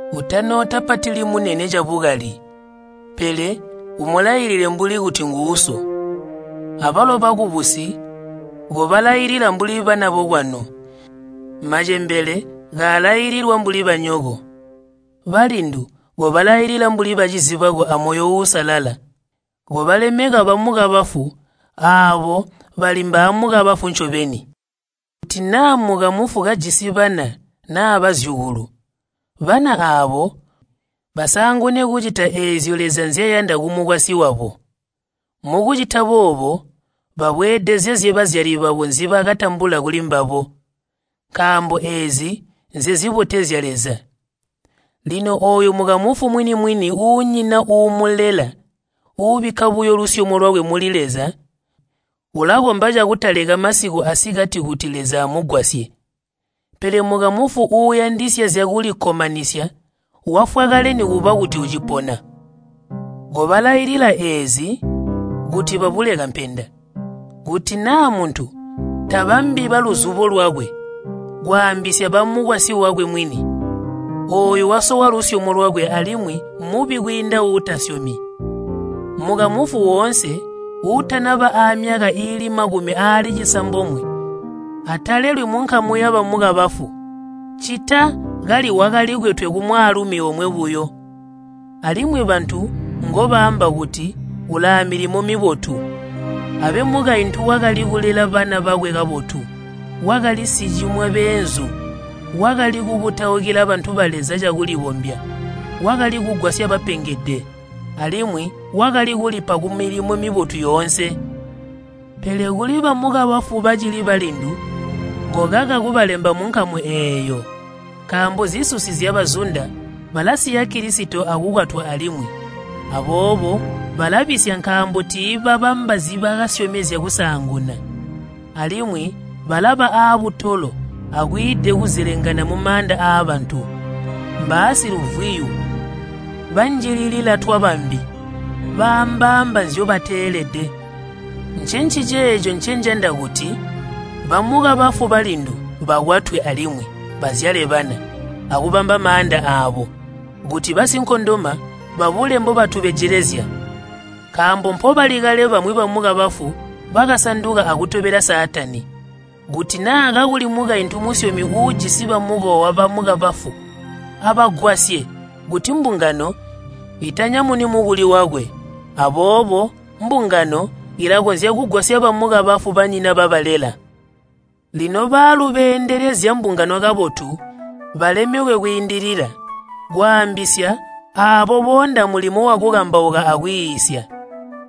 Utanootapatili munene cabukali, pele umulailile mbuli kuti nguuso. Abalo bakubusi kobalailila mbuli bana bokwanu, macembele kaalailila mbuli banyoko, balindu kobalailila mbuli bacizi bako amoyo uusalala. Kobalemeka bamukabafu aabo bali mbaamukabafu ncobeni. Kuti naa mukamufu kajisi bana naa bazyukulu, bana aabo basaangune kucita eezyo Leza nzyayanda kumukwasyi wabo. Mukucita boobo babweedezezye bazyali babo nzibakatambula kuli mbabo. Nkaambo eezi nzezibotezya Leza. Lino ooyo mukamufu mwini-mwini uunyina uumulela ubikka buyo lusyomo lwakwe muli Leza, ulakomba cakutaleka masiku asikati kuti Leza amugwasye. Pele mukamufu uuyandisya zyakulikkomanisya wafwa kale nikuba kuti ucipona. Kobalailila eezi kuti babule kampenda. Kuti naa muntu tabambi baluzubo lwakwe kwaambisya bamukwasyi wakwe mwini, ooyu wasowa lusyomo lwakwe alimwi mubi kwiinda uutasyomi. Mukamufu woonse uutanaba aamyaka iili makumi aali cisambomwe atalelwi munkamu yabamukabafu, ccita kali wakalikwetwe kumwaalumi omwe buyo, alimwi bantu ngobaamba kuti ulaamilimo mibotu. Abe mukaintu wakali kulela bana bakwe kabotu, wakali sicimwa beenzu, wakali kukutaukila bantu ba Leza cakulibombya, wakali kugwasya bapengede, alimwi wakali kulipa kumilimo mibotu yoonse. Pele kuli bamukabafu bacili balindu kokaka kubalemba munkamu eeyo, nkaambo zisusi zyabazunda, balasiya Kilisito akukwatwa alimwi. Aboobo balabisya nkaambo tiibabamba nzibakasyomezya kusaanguna. Alimwi balaba aabutolo akwiide kuzelengana mumaanda aabantu. Mbaasiluvwiyu, banjililila twabambi, baambaamba nzyobateelede. Ncenciceeco ncenjanda kuti bamukabafu balindu bakwatwe alimwi bazyale bana, akubamba maanda aabo, kuti basinkondoma babule mbobatubejelezya. Nkaambo mpobali kale bamwi bamukabafu bakasanduka akutobela Saatani. Kuti naa kakuli mukaintu musyomi uujisi bamukowa bamukabafu, abagwasye kuti mbungano itanyamuni mukuli wakwe. Aboobo mbungano ilakonzya kugwasya bamukabafu banyina babalela. Lino baalu beendelezya mbungano kabotu balemekwe kwiindilila, kwaambisya aabo boonda mulimo wakukambauka akwiisya.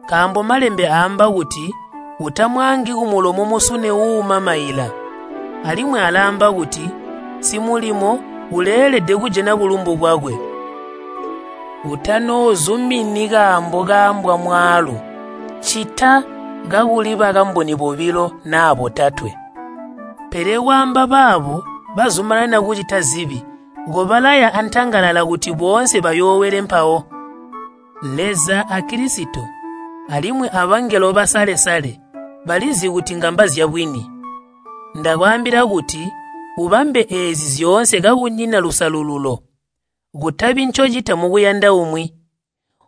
Nkaambo Malembe aamba kuti, “Utamwaangi kumulomo musune uuuma maila.” Alimwi alaamba kuti, “Simulimo uleelede kujana bulumbu bwakwe.” Utanoozumini kaambo kaambwa mwaalu ccita kakuli bakamboni bobilo naa botatwe. Pele kwaamba baabo bazumanana kucita zibi, kobalaya antangalala kuti boonse bayoowele mpawo. Leza a Kilisito, alimwi abangelo basale-sale balizi kuti ngamba zyabwini. Ndakwaambila kuti ubambe eezi zyoonse kakunyina lusalululo, kutabi ncocita mukuyanda umwi.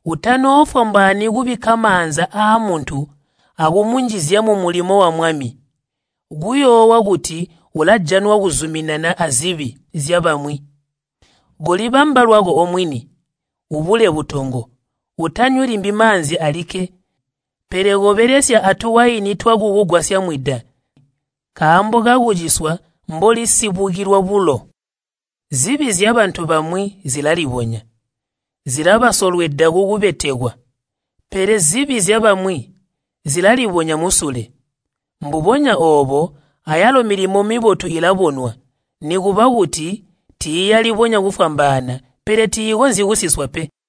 Utanoofwambaani kubikka maanza aamuntu akumunjizya mumulimo wa Mwami, kuyoowa kuti ulajanwa kozuminana azibi zyabamwi. Kolibamba lwako omwini, ubule butongo. Utanywi limbi maanzi alikke, pele kobelesya atuwaini twakukugwasya mwida nkaambo kakuciswa mboli sibukilwa bulo. Zibi zyabantu bamwi zilalibonya, zilabasolweda kukubetekwa, pele zibi zyabamwi zilalibonya musule. Mbubonya oobo ayalo milimo mibotu ilabonwa, nikuba kuti tiiyalibonya kufwambaana, pele tiikonzyi kusiswa pe.